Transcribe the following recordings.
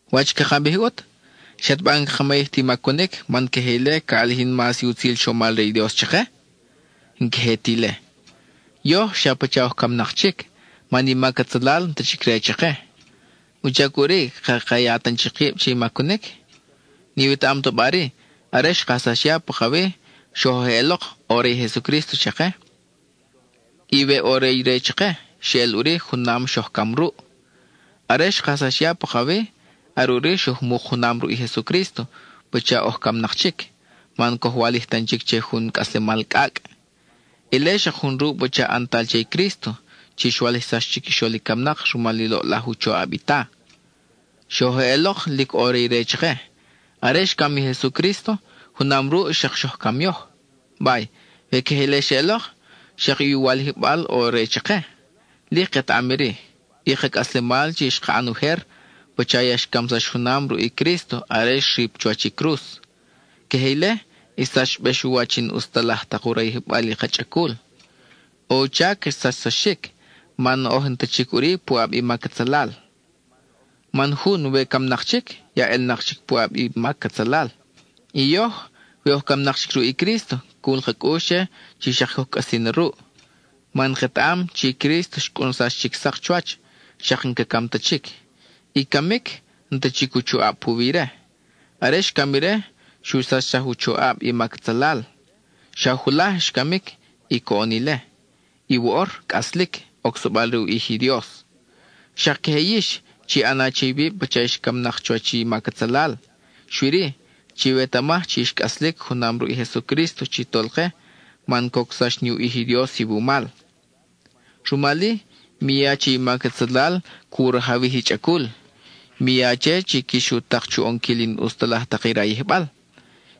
¿Wach caka bij ʼut? ¿Xataba n-caka mayij ti macunic, man queje ile ca ʼalijin mas i utzil chomal re i Dios chake? ¡N-queje ti ile! Yoj xa pacha oj camnak chic, man i mac atzalal n-ta chic re chake. ¿Wuchac ʼuri caka ya tan chic kib che i macunic? ¿N-iwetaʼam ta ba-ri: are xkajsax ya pakawi, xoj ʼelok ʼo re i Jesucrísto chake? Y we ʼo re ire chake, xeʼel ʼuri junam xoj cam ruʼ. Are xkajsax ya pakawi, are ʼuri xoj muk junam ruʼ i Jesucrísto, pacha oj camnak chic, man coj walij tan chic che jun cʼaslemal cʼacʼ. Ile xak jun ruʼ pacha ʼantal che i Crísto, chi xwalijsax chiquixol i camnak rumal i loʼlaj u choʼab i Ta. Xoj ʼelok, lic ʼo re ire chake; are xcam i Jesucrísto, junam ruʼ xak xoj cam yoj. Bay, we queje ile xeʼelok, xak i u walijbal ʼo re chake. Lic ketaʼam iri: i ka cʼaslemal chi xka ʼan ujer, pacha ya xcamsax junam ruʼ i Crísto are xrip chuwach i cruz. Queje ile xsachbex u wach i n-ʼus ta laj tak u rayijbal i ka chʼacul. ʼO u chac xsachsaxic, man oj n-ta chic ʼuri puʼab i mac atzalal. Man jun we camnak chic, ya ʼelnak chic puʼab i mac atzalal. Y yoj, we oj camnak chic ruʼ i Crísto, cul ka cʼux che chi xak coj cʼasi na ruʼ. Man ketaʼam chi Crísto xcʼunsax chic sak chuwach, xak n-ca cam ta chic; I camic, n-ta chic u choʼab puwi ire. Are xcam ire, xu sachsaj u choʼab i mac atzalal. Xa julaj xcamic, y coʼon ile; y woʼor cʼaslic, ocsabal re u ʼij i Dios. Xak queje yix, chi ʼana che iwib pacha ix camnak chuwach i mac atzalal. Xui-ri, chiwetamaj chi ix cʼaslic junam ruʼ i Jesucrísto chi Tolke, man cocsax ni u ʼij i Dios iwumal. Rumal-i, mi ya che i mac atzalal cu rajawij i chʼacul; mi ya che chi quix u tak chu ʼonquil i n-ʼus ta laj tak i rayijbal.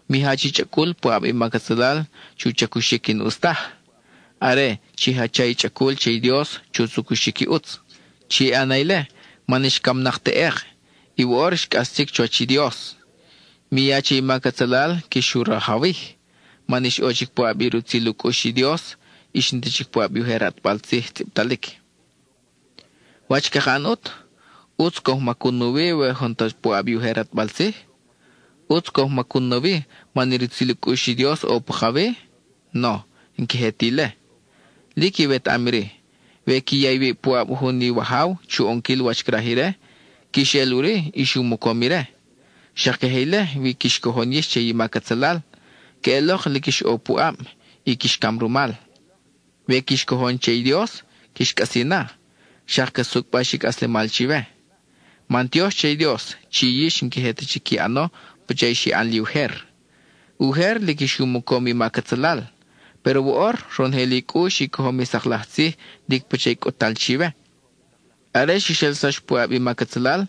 Mi jach i chʼacul puʼab i mac atzalal chu chacuxic i n-ʼus taj. Are, chi jacha i chʼacul che i Dios chu chacuxic i ʼutz. Chi ʼana ile man ix camnak teʼek, y woʼor ix cʼas chic chuwach i Dios. Mi ya che i mac atzalal quix u rajawij, man ix ʼo chic puʼab i rutzil u cʼux i Dios, ix n-ta chic puʼab i ujer ʼatbal tzij tzʼibtalic. ¿Wach caka ʼan ʼut? ¿ʼUtz coj macun nawi we n-oj ta ʼo puʼab i ujer ʼatbal tzij? ¿ʼUtz coj macun nawi man i rutzil u cʼux i Dios ʼo pakawi? ¡No, n-queje ta ile! Lic iwetaʼam iri: we qui ya iwib puʼab jun iwajaw chu ʼonquil wach craj ire, quix eʼel ʼuri ix u mocom ire. Xak queje ile we quix cojon yix che i mac atzalal, queʼelok lic ix ʼo puʼab, y quix cam rumal. We quix cojon che i Dios, quix cʼasi na, xak ca sucʼbax i cʼaslemal chiwe. Mantiox che i Dios chi yix n-queje ta chic qui ʼano pacha xi ʼan li ujer. Ujer lic ix u mocom i mac atzalal, péro woʼor ronojel i cʼux i cojom i sak laj tzij lic pacha i cʼut-tal chiwe. Are xix ʼelsax puʼab i mac atzalal,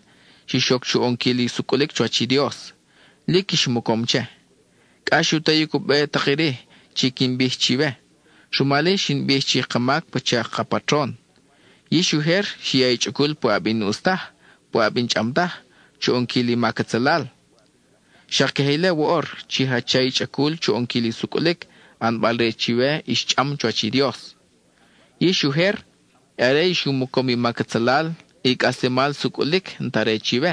xix oc chu ʼonquil i sucʼulic chuwach i Dios; lic ix mocom che. Cʼax u tayic u be i tak iri chi quin bij chiwe, rumal-i xin bij chi i ka mac pacha ka patron. Yix ujer xi ya i chʼacul puʼab i n-ʼus taj, puʼab i n-chʼam taj, chu ʼonquil i mac atzalal. Xak queje ile woʼor, chi jacha i chʼacul chu ʼonquil i sucʼulic, ʼanbal-re chiwe ix chʼam chuwach i Dios. Yix ujer, are ix u mocom i mac atzalal, i cʼaslemal sucʼulic n-ta re chiwe.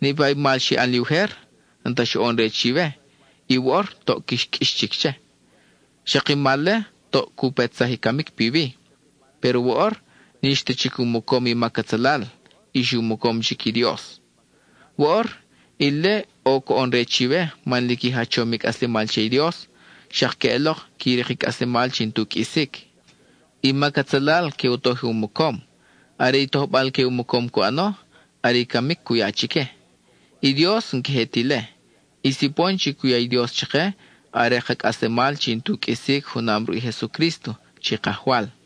Niʼpa i mal xi ʼan li ujer, n-ta xoʼon-re chiwe, y woʼor toʼ quix qʼuix chic che. Xak i mal-le toʼ cu petsaj i camic piwi. Péro woʼor, n-ix ta chic u mocom i mac atzalal, ix u mocom chic i Dios. Woʼor, ile ʼo coʼon-re chiwe man lic i jachom i cʼaslemal che i Dios, xak queʼelok qui rik i cʼaslemal chi n-tu qʼuisic. I mac atzalal que u toj i u mocom; are i tojbal que u mocom cu ʼano, are i camic cu ya chique. I Dios n-queje ta ile; i sipon chi cu ya i Dios chake are ka cʼaslemal chi n-tu qʼuisic junam ruʼ i Jesucrísto, chi Kajwal.